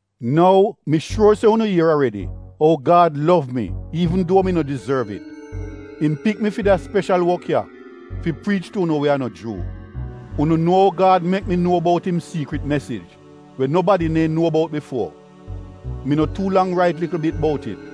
Nou, mi shuor se unu ier aredi ou Gad did gud an kain tu mi an ou im pik mi fi da speshal wok ya — fi priich tu unu we a no Juu. Unu nuo ou Gad mek mi nuo bout im siikrit mesij, we nobadi neehn nuo bout bifuo. Mi no tuu lang rait likl bit bout it.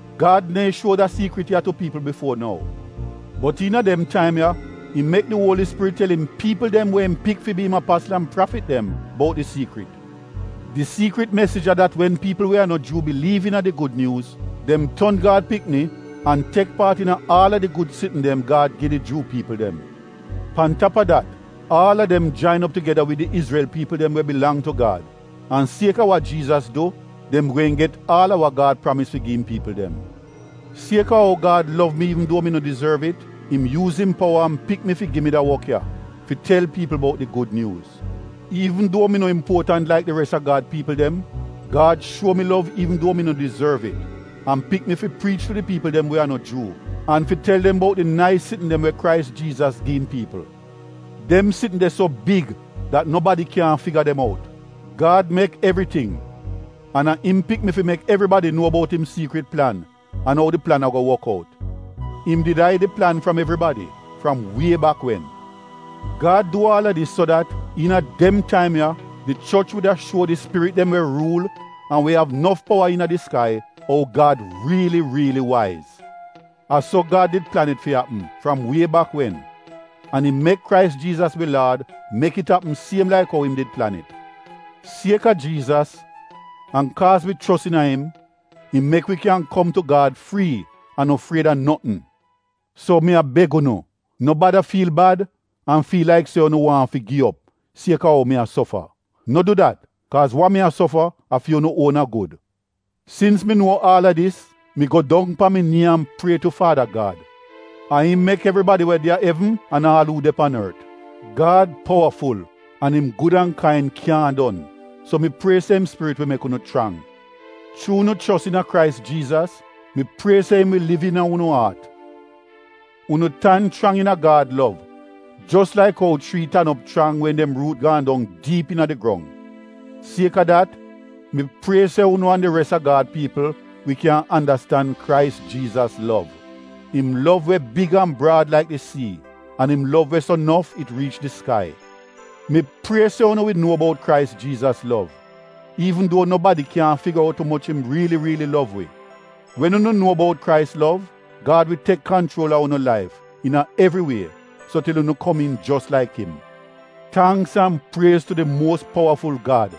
Gad neehn shuo da siikrit ya tu piipl bifuo nou. Bot iina dem taim ya, im mek di Uoli Spirit tel im piipl dem we im pik fi bi im apasl an prafit dem bout di siikrit. Di siikrit mesij a dat wen piipl we a no Juu biliiv iina di Gud Nyuuz, dem ton Gad pikni an tek paat iina aal a di gud sitn dem Gad gi di Juu piipl dem. Pan tap a dat, aal a dem jain op tugeda wid di Izrel piipl dem we bilang tu Gad an, sieka wa Jiizas du, dem gweehn get aal a wa Gad pramis fi gi im piipl dem. Sieka ou Gad gud an kain tu mi, im yuuz im powa an pik mi fi gi mi da wok ya fi tel piipl bout di Gud Nyuuz. Iivn duo mi no impuotant laik di res a Gad piipl dem, Gad gud an kain tu mi an pik mi fi priich tu di piipl dem we a no Juu an fi tel dem bout di nais sitn dem we Krais Jiizas gi im piipl. Dem sitn de so big dat nobadi kyaahn figa dem out. Gad mek evriting an a im pik mi fi mek evribadi nuo bout im siikrit plan an ou di plan ago wok out. Im did aid di plan fram evribadi, fram wie bak wen. Gad du aal a dis so dat, iina dem taim ya, di choch wuda shuo di spirit dem we ruul an we av nof powa iina di skai, ou Gad riili riili waiz. A so Gad did plan it fi apm fram wie bak wen, an im mek Krais Jiizas wi laad mek it apm siem laik ou im did plan it. Sieka Jiizas an kaaz wi chos iina im, im mek wi kyan kom tu Gad frii an no fried a notn. So, mi a beg unu, no bada fiil bad an fiil laik se unu waahn fi gi op, sieka ou mi a sofa. No du dat, kaaz wa mi a sofa a fi unu uona gud. Sins mi nuo aal a dis, mi go dong pan mi nii an prie tu faada Gad. A im mek evribadi we de a evn an aal uu de pan ort. Gad powaful an im gud an kain kyaahn don, so mi prie se im Spirit wi mek unu chrang. Chuu unu chos iina Krais Jiizas, mi prie se im wi liv iina unu aat. Unu tan chrang iina Gad lov jos laik ou chrii tan op chrang wen dem ruut gaan dong diip iina di grong. Sieka dat, mi prie se unu an di res a Gad piipl wi kyan andastan Krais Jiizas lov — im lov we big an braad laik di sii an im lov we so nof it riich di skai. Mi prie se unu wi nuo bout Krais Jiizas lov iivn duo nobadi kyaahn figa out umoch im riili riili lov wi. Wen unu nuo bout Krais lov, Gad wi tek kanchuol a unu laif iina evri wie so til unu komiin jos laik im. Tangks an priez tu di muos powaful Gad!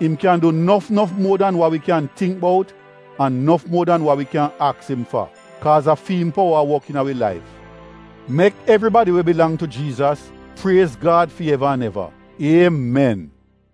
Im kyan du nof nof muor dan wa wi kyan tingk bout an nof muo dan wa wi kyan aks im fa, kaaz a fi im powa a wok iina wi laif! Mek evribadi we bilang tu Jiizas, priez Gad fi eva an eva. Iemen!